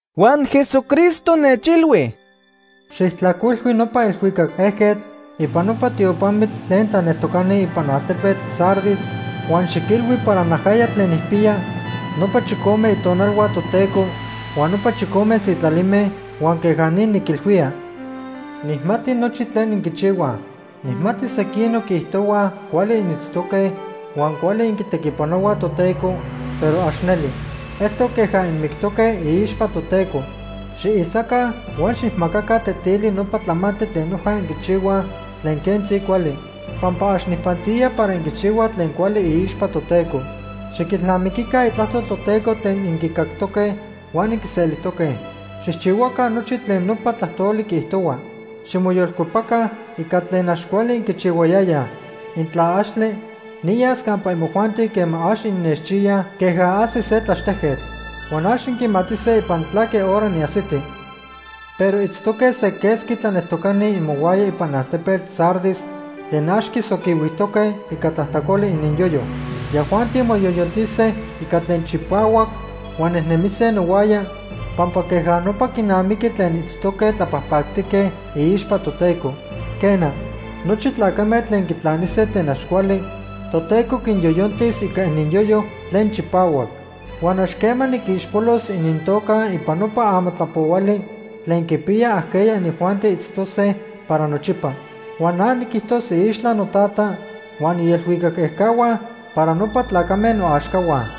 Huan Jesucristo nechilhui: “Xijtlajcuilhui nopa elhuicac ejquetl ipan nopa tiopamitl tlen tlaneltocani ipan altepetl Sardis huan xiquilhui para najaya tlen nijpiya nopa chicome itonalhua Toteco huan nopa chicome sitlalime, huan queja ni niquilhuía: “Nijmati nochi tlen inquichihuaj. Nijmati sequinoc quiijtohuaj cuali initztoque huan cuali inquitequipanohuaj Toteco, pero ax neli. Eltoc queja inmictoque iixpa Toteco. Xiisaca huan xijmacaca tetili nopa tlamantli tlen noja inquichihuaj tlen quentzi cuali, pampa ax nijpantía para inquichihuaj tlen cuali iixpa Toteco. Xiquilnamiquica itlajtol Toteco tlen inquicajtoque huan inquiselijtoque. Xijchihuaca nochi tlen nopa tlajtoli quiijtohua. Ximoyolcuepaca ica tlen ax cuali inquichihuayayaj. Intla axtle, niyas campa imojuanti quema ax innechchiyaj queja ajsi se tlaxtejquetl. Huan ax inquimatise ipan tlaque hora niajsiti. “Pero itztoque se quesqui tlaneltocani imohuaya ipan altepetl Sardis tlen ax quisoquihuijtoque ica tlajtlacoli ininyoyo. Yajuanti moyoyontise ica tlen chipahuac huan nejnemise nohuaya, pampa queja nopa quinamiqui tlen itztoque tlapajpactique iixpa Toteco. Quena, nochi tlacame tlen quitlanise tlen ax cuali Toteco quinyoyontis ica ininyoyo tlen chipahuac. Huan ax quema niquixpolos inintoca ipan nopa amatlapohuali tlen quipiya ajqueya inijuanti itztose para nochipa. Huan na niquijtos iixtla noTata huan ielhuicac ejcahua para nopa tlacame noaxcahua.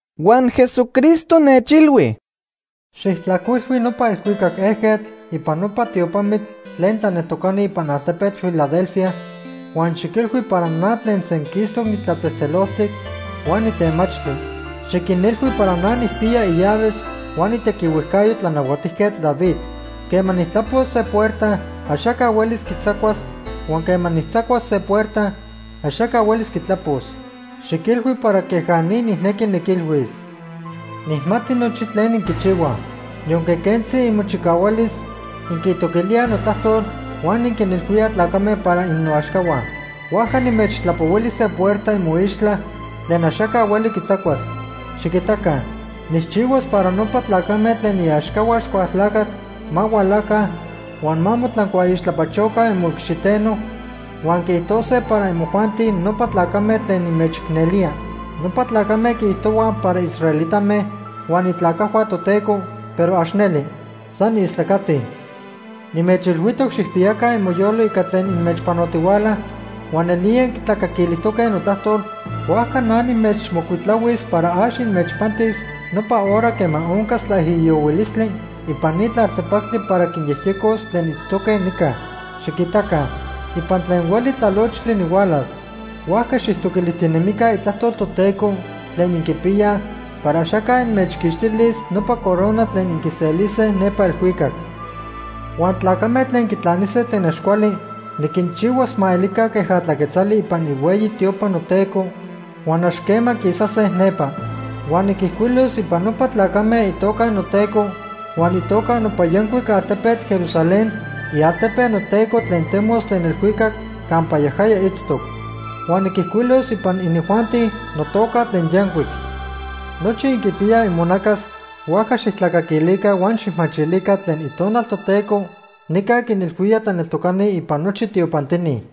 Huan Jesucristo nechilhui: “Xijtlajcuilhui nopa elhuicac ejquetl ipan nopa tiopamitl tlen tlaneltocani ipan altepetl Filadelfia huan xiquilhui para na tlen senquistoc nitlatzejtzeloltic huan nitemachtli. Xiquinilhui para na nijpiya illaves huan itequihuejcayo Tlanahuatijquetl David. Quema nijtlapos se puerta, axaca huelis quitzacuas huan quema nijtzacuas se puerta, axaca huelis quitlapos. Xiquilhui para queja ni nijnequi niquilhuis: “Nijmati nochi tlen inquichihuaj. Yonque quentzi imochicahualis, inquitoquilíaj notlajtol huan inquinilhuíaj tlacame para innoaxcahua. Huajca nimechtlapohuili se puerta imoixtla tlen axaca hueli quitzacuas. Xiquitaca, nijchihuas para nopa tlacame tlen iaxcahua Axcualtlacatl ma hualaca huan ma motlancuaixtlapachoca imoicxiteno, huan quiijtose para imojuanti nopa tlacame tlen nimechicnelía. Nopa tlacame quiijtohuaj para israelitame huan itlacajhua Toteco, pero ax neli. San istlacatij. “Nimechilhuijtoc xijpiyaca imoyolo ica tlen inmechpanotihuala huan nelía inquitlacaquilijtoque notlajtol, huajca na nimechmocuitlahuis para ax inmechpantis nopa hora quema oncas tlaijiyohuilistli ipan ni tlaltepactli para quinyejyecos tlen itztoque nica. Xiquitaca, ipan tlen hueli tlalochtli nihualas. Huajca xijtoquilijtinemica itlajtol Toteco tlen inquipiyaj para axaca inmechquixtilis nopa corona tlen inquiselise nepa elhuicac. Huan tlacame tlen quitlanise tlen ax cuali niquinchihuas ma elica queja tlaquetzali ipan ihueyi tiopa noTeco, huan ax quema quisase nepa. Huan niquijcuilos ipan nopa tlacame itoca noTeco huan itoca nopa yancuic altepetl Jerusalén, ialtepe noTeco tlen temos tlen elhuicac campa yajaya itztoc. Huan niquijcuilos ipan inijuanti notoca tlen yancuic. Nochi inquipiyaj imonacas, huajca xijtlacaquilica huan xijmachilica tlen Itonal Toteco nica quinilhuía tlaneltocani ipan nochi tiopantini.”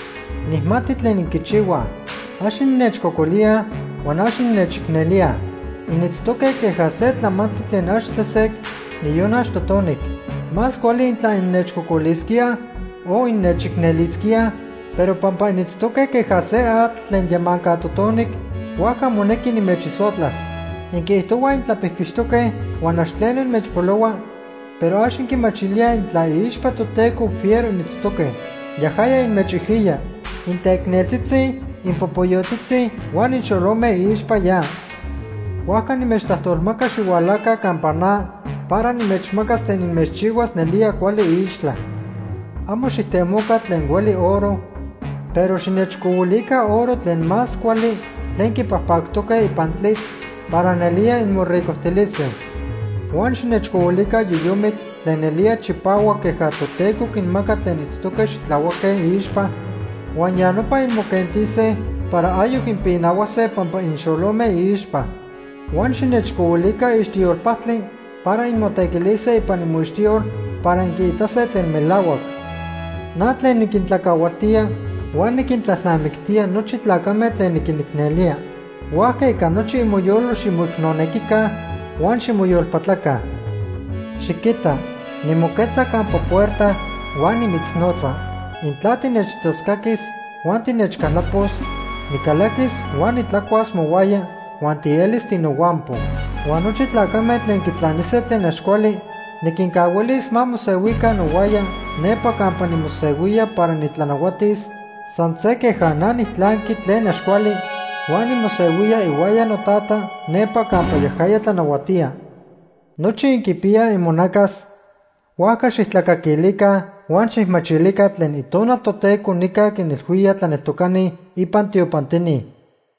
“Nijmati tlen inquichihuaj. Ax innechcocolíaj huan ax innechicnelíaj. Initztoque queja se tlamantli tlen ax sesec, niyon ax totonic. Más cuali intla innechcocolisquíaj o innechicnelisquíaj, pero pampa initztoque queja se atl tlen yamanca totonic, huajca monequi nimechisotlas. Inquiijtohuaj intlapijpixtoque huan ax tleno inmechpolohua, pero ax inquimachilíaj intla iixpa Toteco fiero initztoque. Yajaya inmechijiya. Inteicneltzitzi, inpopoyotzitzi huan inxolome iixpa ya. Huajca nimechtlajtolmaca xihualaca campa na para nimechmacas tlen inmechchihuas nelía cuali iixtla. Amo xijtemoca tlen hueli oro, pero xinechcohuilica oro tlen más cuali tlen quipajpactoque ipan tlitl para nelía inmoricojtilise. Huan xinechcohuilica yoyomitl tlen nelía chipahuac queja Toteco quinmaca tlen itztoque xitlahuaque iixpa, huan ya nopa inmoquentise para ayoc inpinahuase pampa inxolome iixpa. Huan xinechcohuilica ixtiyol pajtli para inmotequilise ipan imoixtiyol para inquiitase tlen melahuac. “Na tlen niquintlacahualtía huan niquintlalnamictía nochi tlacame tlen niquinicnelía, huajca ica nochi imoyolo ximoicnonequica huan ximoyolpatlaca. “Xiquita, nimoquetza campa puerta huan nimitznotza. Intla tinechtoscaquis huan tinechcaltlapos, nicalaquis huan nitlacuas mohuaya huan tielis tinohuampo. Huan nochi tlacame tlen quitlanise tlen ax cuali niquincahuilis ma mosehuica nohuaya nepa campa nimosehuía para nitlanahuatis, san se queja na nijtlanqui tlen ax cuali huan nimosehuía ihuaya noTata nepa campa yajaya tlanahuatía. Nochi inquipiyaj imonacas, huajca xijtlacaquilica huan xijmachilica tlen Itonal Toteco nica quinilhuía tlaneltocani ipan tiopantini.”